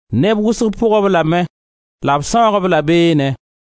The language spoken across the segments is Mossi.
Neb wʋsg pʋg-b lame la b sãoog-b la beenẽ.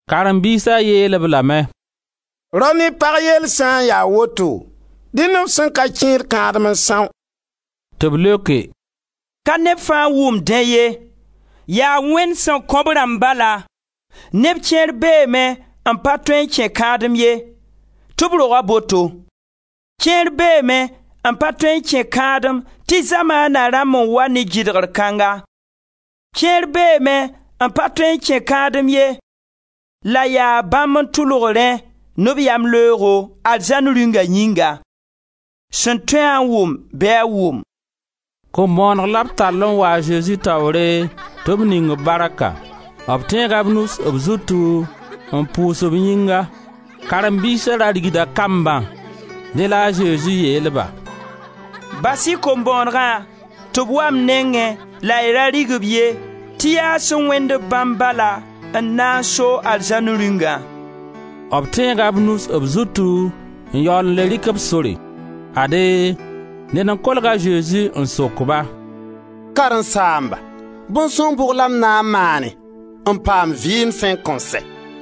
Karen-biisa yeel-b lame: «Rao ne pag yell sã n ya a woto, dẽnd f sẽn ka kẽed kãadem n são!» Tɩ b leoke: «Ka neb fãa n wʋmd dẽ ye, yaa Wẽnd sẽn kõ b rãmb bala. Neb kẽer beeme n pa tõe n kẽ kãadem ye, tɩ b roga boto; kẽer beeme n pa tõe n kẽ kãadem tɩ Zamaana rãmb n wa ne gɩdgr kãnga; kẽer beeme n pa tõe n kẽ kãadem ye la yaa bãmb n tʋlg rẽ ne b yamleoogo, Arzãn Rĩunga yĩnga. Sẽn tõe-a n wʋm, bɩ a wʋm!» Kom-bõoneg la b tall n wa a Zezi taoore tɩ b ning-b barka; b tẽega b nus b zutu n pʋʋs b yĩnga. Karen-biisa da rigda kambã. Dẽ la a Zezi yeel-ba: «Bas-y kom-bõonegã tɩ b wa m nengẽ la y da rig-b ye tɩ yaa sẽn wẽnd-b bãmb bala n na n soog Arzãn Rĩungã.» B tẽega b nus b zutu n yaool n le rɩk b sore. Ade, ned n kolg a Zezi n sok-ba: «Karen-saamba, bõn-sõng bʋg la m na n maane, n paam vɩɩm sẽn kõn sɛ?»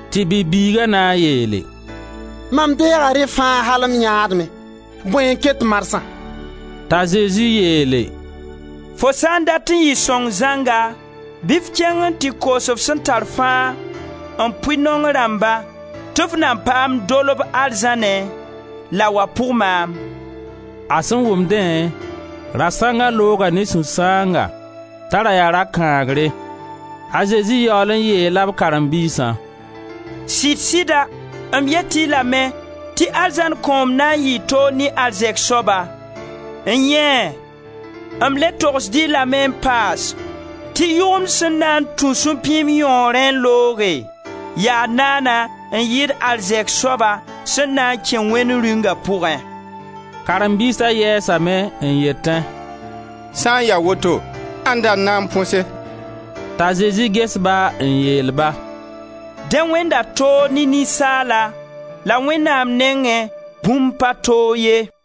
Tɩ bi-bɩɩga na n yeele: «Mam deega rẽ fãa al m yãadmẽ. Bõe n ket marsã?» T'a Zezi yeele: «Fo sã n dat n yɩ sõng zãnga, bɩ f kẽng n tɩ koos f sẽn tar fãa n pʋɩ naong rãmba tɩ f na paam dolb arzãnẽ, la wa pʋg maam.» A sẽn wʋm dẽ, rasãnga looga ne sũ-sãanga t'a ra yaa rakãagre. A Zezi yaool n yeela b karen-biisã: «Sɩd-sɩda m yet-y lame tɩ arzãn kõom na yɩ toog ne arzɛk soaba. N-yẽe, m le togsd-y lame n paas tɩ yʋgemd sẽn na n tũ supĩim yõorẽ n looge yaa naana n yɩɩd arzɛk soaba sẽn na n kẽ Wẽnd Rĩunga pugẽ.» Karen-biisa yɛɛsame, n yetẽ: «Sã n ya woto ãnda n na n põse?» T'a Zezi ges-ba n yeel-ba: «Dẽ wẽnda toog ne ninsaala la Wẽnnaam nengẽ, bũmb pa toog ye.»